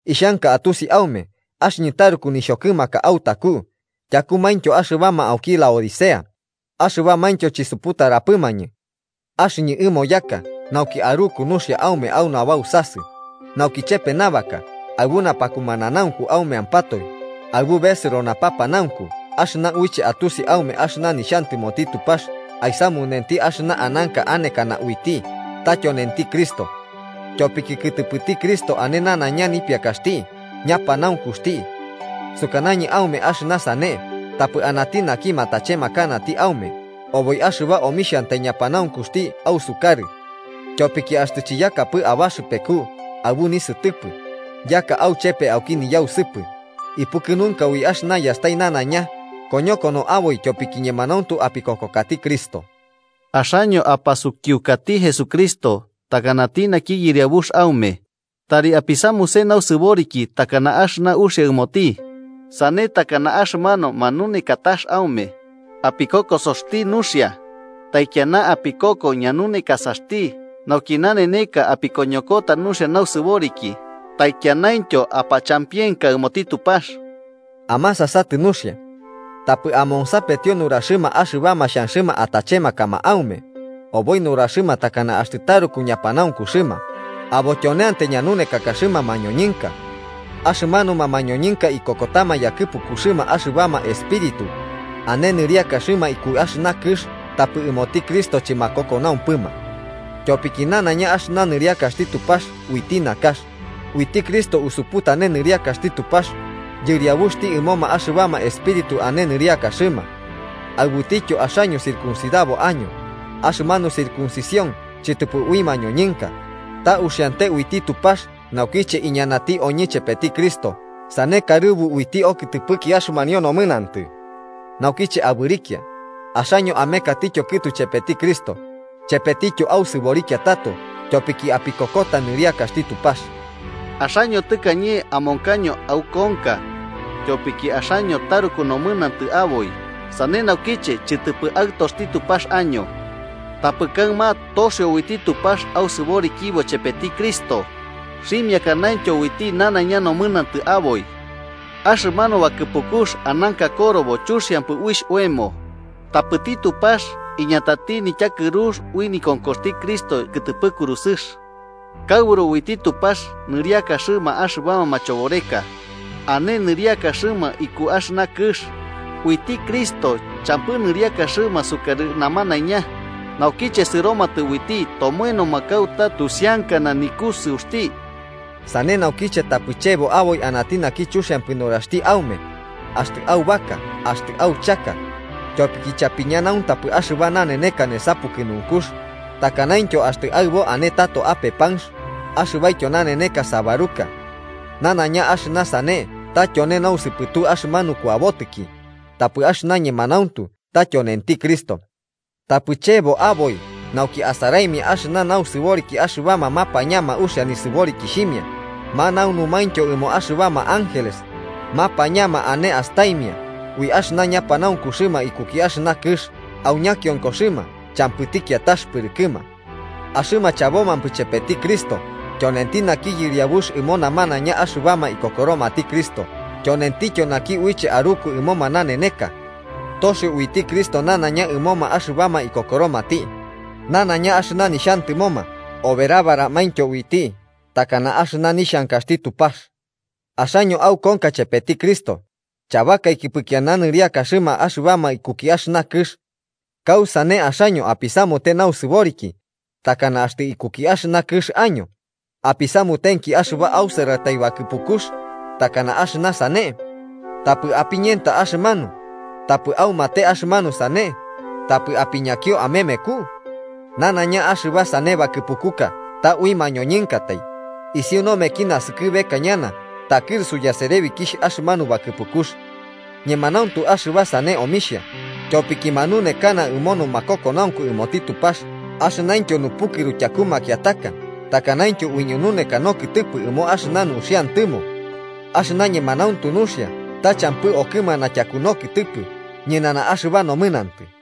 Ixhanka atusi aume axɨñɨ taruku nixhokɨmaka autaku, tyakumaintyo axɨbama auki Laodicea axɨbamaintyo chisuputaramapɨmañɨ. Axɨñɨ ɨmo yaka nauki aruku nuxia aume au nabausasɨ, nauki chepe nabaka aɨbu napakumananaunku aumeampatoe aɨbu besɨro napapanaunku axɨna uiche atusi aume axɨna nixhantɨmoti Tupax aisamunenti axɨna ananka anekana uiti, ta tyonenti Cristo. Tyopiki kɨtɨpɨti Cristo ane nanaiña nipiakaxti ñapanaunkuxti. Sukanañɨ aume axɨna sane tapɨ anati naki matachemakanati aume oboi axɨba omixhantai ñapantuxti ausukarɨ. Tyopiki axtɨ chiyakapɨ abaxɨpeku aɨbu nisɨtɨpɨ, yaka auchepe auki niyausɨpɨ, ipukɨnunka ui axɨna yastai nanaiña koñokono aboi tyopiki ñemanauntu apikokokati Cristo. Axaño apasukiukati Jesucristo takanati naki Yɨriabux aume, tari apisamuse nausɨboriki takana axɨna uxia ɨmoti, sane takana axɨmanu manunekatax aume, apikokosoti nuxia, taikiana apikoko ñanunekasaxti nauki naneneka apikoñokota nuxia nausɨboriki, taikianaintyo apachampienka ɨmoti Tupax. Amasasatɨ nuxia. Tapɨ amonsapetio nuraxɨma axɨbama xhanxɨma atachemakama aume oboi nuraxɨma takana axtɨ taruku ñapanaunkuxɨma, abo tyoneantai ñanunekakaxɨma mañoñɨnka. Axɨmanuma mañoñɨnka ikokotama yakɨpukuxɨma axɨbama espíritu ane nɨriakaxɨma iku axɨna kɨx tapɨ ɨmoti Cristo chɨmakokonaumpɨma. Tyopiki nanaiña axɨna nɨriakaxti Tupax uiti nakax, uiti Cristo usuputane nɨriakaxti Tupax, Yɨriabuxti ɨmoma axɨbama espíritu ane nɨriakaxɨma. Aɨbutityo, axaño circuncidabo año, axɨmanu circuncisión chɨtɨpɨ ui mañoñɨnka, ta uxiante uiti Tupax naukiche iñanati oñɨ chepeti Cristo sane karɨbu uiti okɨtɨpɨki axɨmanio nomɨnantɨ. Naukiche abɨrikia, axaño amekatityo kɨtu chepeti Cristo, chepetityo ausɨborikia tato, tyopiki apikokota nɨriakaxti Tupax. Axaño tɨkañe amonkaño aukonka, tyopiki axaño taruku nomɨnantɨ aboi sane naukiche chɨtɨpɨ aɨtoxti Tupax año. Tapɨ kaɨma toxio uiti Tupax ausɨborikibo chepeti Cristo, xhimiakanaintyo uiti nanaiña nomɨnantɨ aboi. Axɨmanu bakɨpukux ananka korobo chuxiampɨ uixh oemo, tapɨti Tupax iñatati nityakɨrux ui nikonkoxti Cristo kɨtɨpɨ kurusɨx. Kaɨburu uiti Tupax nɨriakaxɨma axɨbama machoboreka ane nɨriakaxɨma iku axɨna kɨx, uiti Cristo champɨ nɨriakaxɨma sukarɨ namanaiña, naukiche sɨromatɨ uiti tomoenoma kauta tusiankana nikusɨuxti. Sane naukiche tapɨ chebo oboi anati naki chuxiampɨ nuraxti aume axtɨ aubaka axtɨ auchaka, tyopiki chapiñanauntapɨ axɨba naneneka nesa pukɨnunkux, takanaintyo axtɨ aɨbo ane tato ape panx axɨbaityo naneneka sábaruka. Nanaiña axɨna sane ta tyone nausɨpɨtu axɨmanu kuabotiki, tapɨ axɨna ñemanauntu ta tyonenti Cristo. Tapɨ chebo aboi nauki asaraimia axɨna nausɨboriki axɨbama mapañama uxia nisɨborikixhimia manaunumaintyo ɨmo axɨbama ángeles, mapañama ane astaimia ui axɨna ñapanaunkuxɨma ikuki axɨna kɨx au ñakionkoxɨma champɨti kiatax pɨrɨkɨma. Axɨma chabomampɨ chepeti Cristo, tyonenti naki Yɨriabux ɨmo namanaiña axɨbama ikokoromati Cristo tyonentityo naki uiche aruku ɨmoma naneneka. Torio uiti Cristo nanaiña ɨmoma axɨbama ikokoromati nanaiña axɨna nixhantɨmoma, oberabaramaintyo uiti takana axɨna nixhankaxti Tupax. Axaño aukonka chepeti Cristo, chabakaikipɨ kiana nɨriakaxɨma axɨbama ikuki axɨna kɨx. ¿Kausane, axaño apisamute nausɨboriki takana axtɨ ikuki axɨna kɨx año, apisamutenki axɨba ausɨratai bakɨpukux takana axɨna sane: “Tapɨ apiñenta axɨmanu, tapɨ aumate axɨmanu sane, tapɨ apiñakio amemeku”? Nanaiña axɨba sane bakɨpukuka ta ui mañoñɨnkatai, isiu nomeki naskɨbeka ñana takɨrusu yaserebikixh axɨmanu bakɨpukux. Ñemanauntu axɨba sane omixhia, tyopiki manunekana ɨmo numakokonaunku ɨmoti Tupax axɨnaintyo nupukɨru tyaku makiataka takanaintyo uiñununeka nokɨtɨpɨ ɨmo axɨna nuxiantɨmo. Axɨna ñemanauntu nuxia ta champɨ okɨmana tyaku nokɨtɨpɨ ñɨnana axɨba nomɨnantɨ.